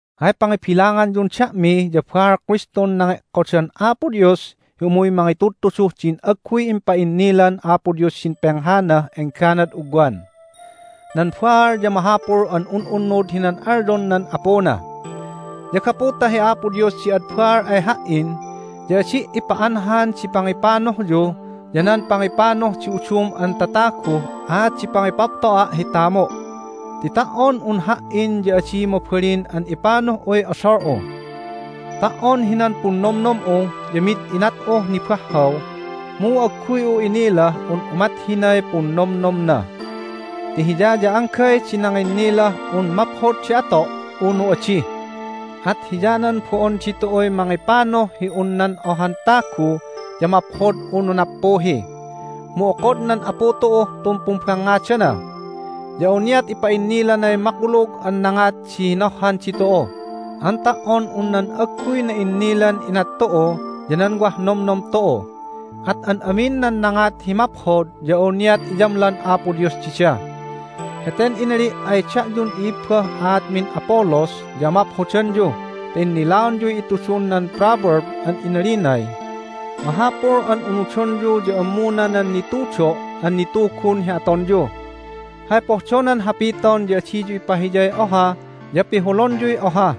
Hay pangibilanganyun da'mi ya baal Kristun nange'kodan Apo Dios hi umuy mangitudtuduh din agguy impa'innilan Apo Dios hidin penghanah engganad ugwan. Nan baal ya mahapul an un'unnud hinan alyon nan apuna. Ya gapu ta hi Apo Dios di ad baal ay ha"in ya adi' ipa'anhan di pangipanuhyu ya nan pangipanuh di udum an tataguh aat di pangipapto'a' hi tamu'. Ti ta"on un ha"in ya adi mabalin an ipanuh'uy odol'u. Ta"on hinan punnomnom'u ya mi'id inat'uh nibahhaw, mu agguy'u inilah un umat hinay punnomnomna. Ti Hiya ya anggay di nanginnilah un maphod di ato' unu adi. At hiyanan bo'on ditu'uy mangipanuh hi un nan ohan tagu ya maphod unu nappuhi, mu okod nan Apu tu'uh tun pumbangngadana. Ya awniat ipa'innilanay makulug an nangat di hinohhan ditu'u an ta"on un nan agguy na'innilan inat tu'u ya nan wah nomnom tu'u. At an amin nan nangat hi maphod ya awniat iyamlan Apo Dios dida. Heten inali' ay da'yun i'ibbah aatmin Apollos ya amaphodanyu ta innilaonyuy itudun nan proverb an inalinay, "Mahapul an unudonyu ya ammuna nan nitudo' an nitugun hi atonyu." Hay pohdonan hapiton ya adiyu ipahiyay oha ya pihulonyuy oha.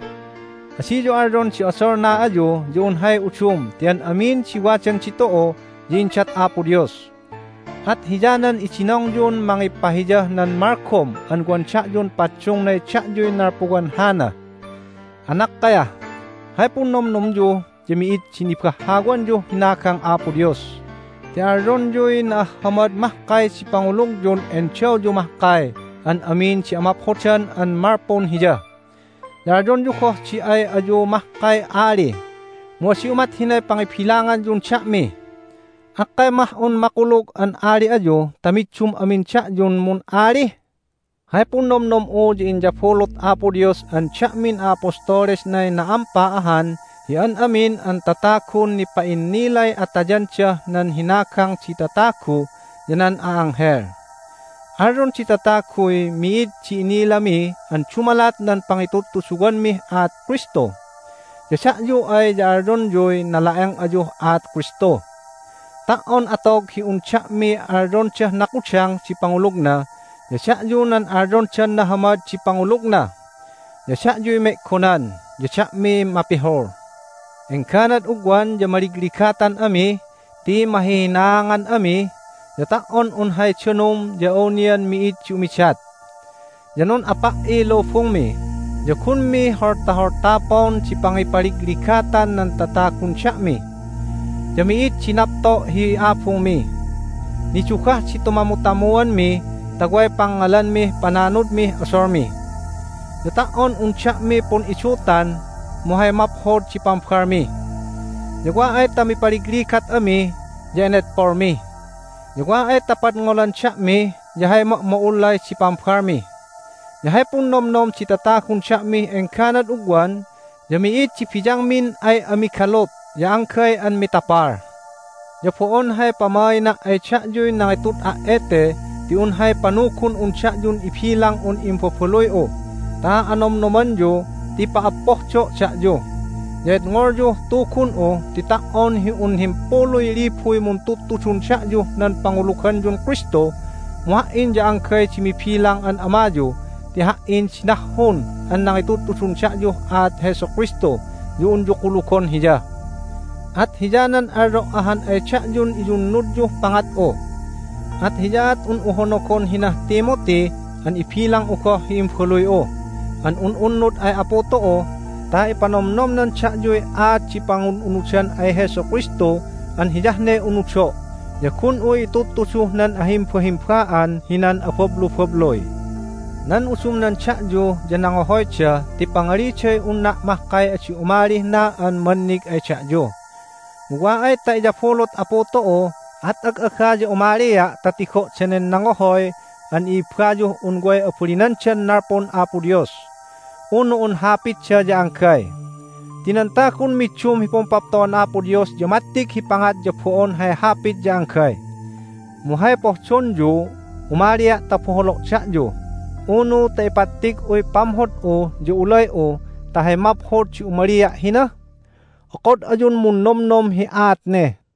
Adiyu alyon di odolna ayu ya un hay udum ti an amin di wadan ditu'u ya indat Apo Dios. At hiyanan idinongyun mangipahiyah nan malgom an wan da'yun paddungnay da'yuy nalpuwan hana. Anakkayah! Hay punnomnomyu ya mi'id di nibahhawanyuh hinagang Apo Dios ti alyonyuy na'ahhamad mahkay di pangulugyun endawyu mahkay an amin di amaphodan an malpun Hiya. Ya alyonyu goh di ay ayu mahkay ali, mu adi umat hinay pangibilangyun da'mi. Akkay mah un makulug an ali ayu ta middum amin da'yun mun'ali? Hay punnomnom'u ya inyabulut Apo Dios an da'min a'apostolesnay na'ampa ahan hi an amin an tatagun nipa'innilay atayandah nan hinagang di tatagu ya nan a'anghel. Alyon di tataguy mi'id di inilami an dumalat nan pangitudtuduwanmih aat Kristu. Ya da'yu ay ya alyonyuy nala'eng ayuh aat Kristu. Ta"on atog hi un da'miy alyondah nakudang di pangulugna ya da'yu nan alyondan nahamad di pangulugna. Ya da'yuy me'gonan, ya da'miy mapihul! Engganad ugwan ya maligligatan ami ti mahihinaangan ami, ya ta"on un hay danum ya awnian mi'id di umidat. Ya nun'apa"iy lubungmi, ya gunmi holtaholtapon di pangipaligligatan nan tatagun da'mi. Ya mi'id di napto' hi abungmi. Nidugah di tumamutamuanmi ta way pangngalanmih pananudmih odolmi. Ya ta"on un da'mi pun'idutan mu hay maphod di pambalmi. Ya wa ay ta mipaligligat ami ya enedpolmi, ya wa ay ta padngolan da'mi ya hay ma'ma'ullay di pambalmi. Ya hay punnomnom di tatagun da'mih engganad ugwan ya mi'id di biyangmin ay ami galut ya anggay an mitapal! Ya bo'on hay pamaina' ay da'yuy nangitud'a' ete ti un hay panugun'un da'yun ibilang'un imbabaluy'u ta anomnomanyu ti pa'appohdo' da'yu. Ya edngolyuh tugun'u ti ta"on hi un himpuluy libuy muntudtudun da'yuh nan panguluganyun Kristu mu ha"in ya anggay di mibilang an amayu ti ha"in di nahhun an nangitudtudun da'yuh aat Jesu Kristu ya unyu kulugon Hiya. At hiyanan alyo' ahan ay da'yun iyunnudyuh pangat'u. At hiyaat un'u honogon hinah Timothy an ibilang'u goh hi imbaluy'u an un'unnud ay Apu tu'u ta ipanomnomnan da'yuy aat di pangun'unudan ay Jesu Kristu an hiyah ne unudo' ya gun'u itudtuduh nan ahimbahimba'an hinan abablubabluy. Nan udumnan da'yu ya nangohoyda ti pangaliday unna' mahkay adi umalih na an mannig ay da'yu. Mu wa ay ta iyabulut Apu tu'u at ag'aga ya umalia' ta tigo' danen nangohoy an i'ibbayuh un way abalinandan nalpun Apo Dios, unu un hapitda ya anggay! Ti nan tagun middum hi pumpapto'an Apo Dios ya mattig hi pangat ya bo'on hay hapit ya anggay. Mu hay pohdonyu---umalia' ta boholo' da'yu, unu ta ipattig'uy pamhod'u ya ulay'u ta hay maphod di umalia' hina? Okod ayun munnomnom hi aat ne.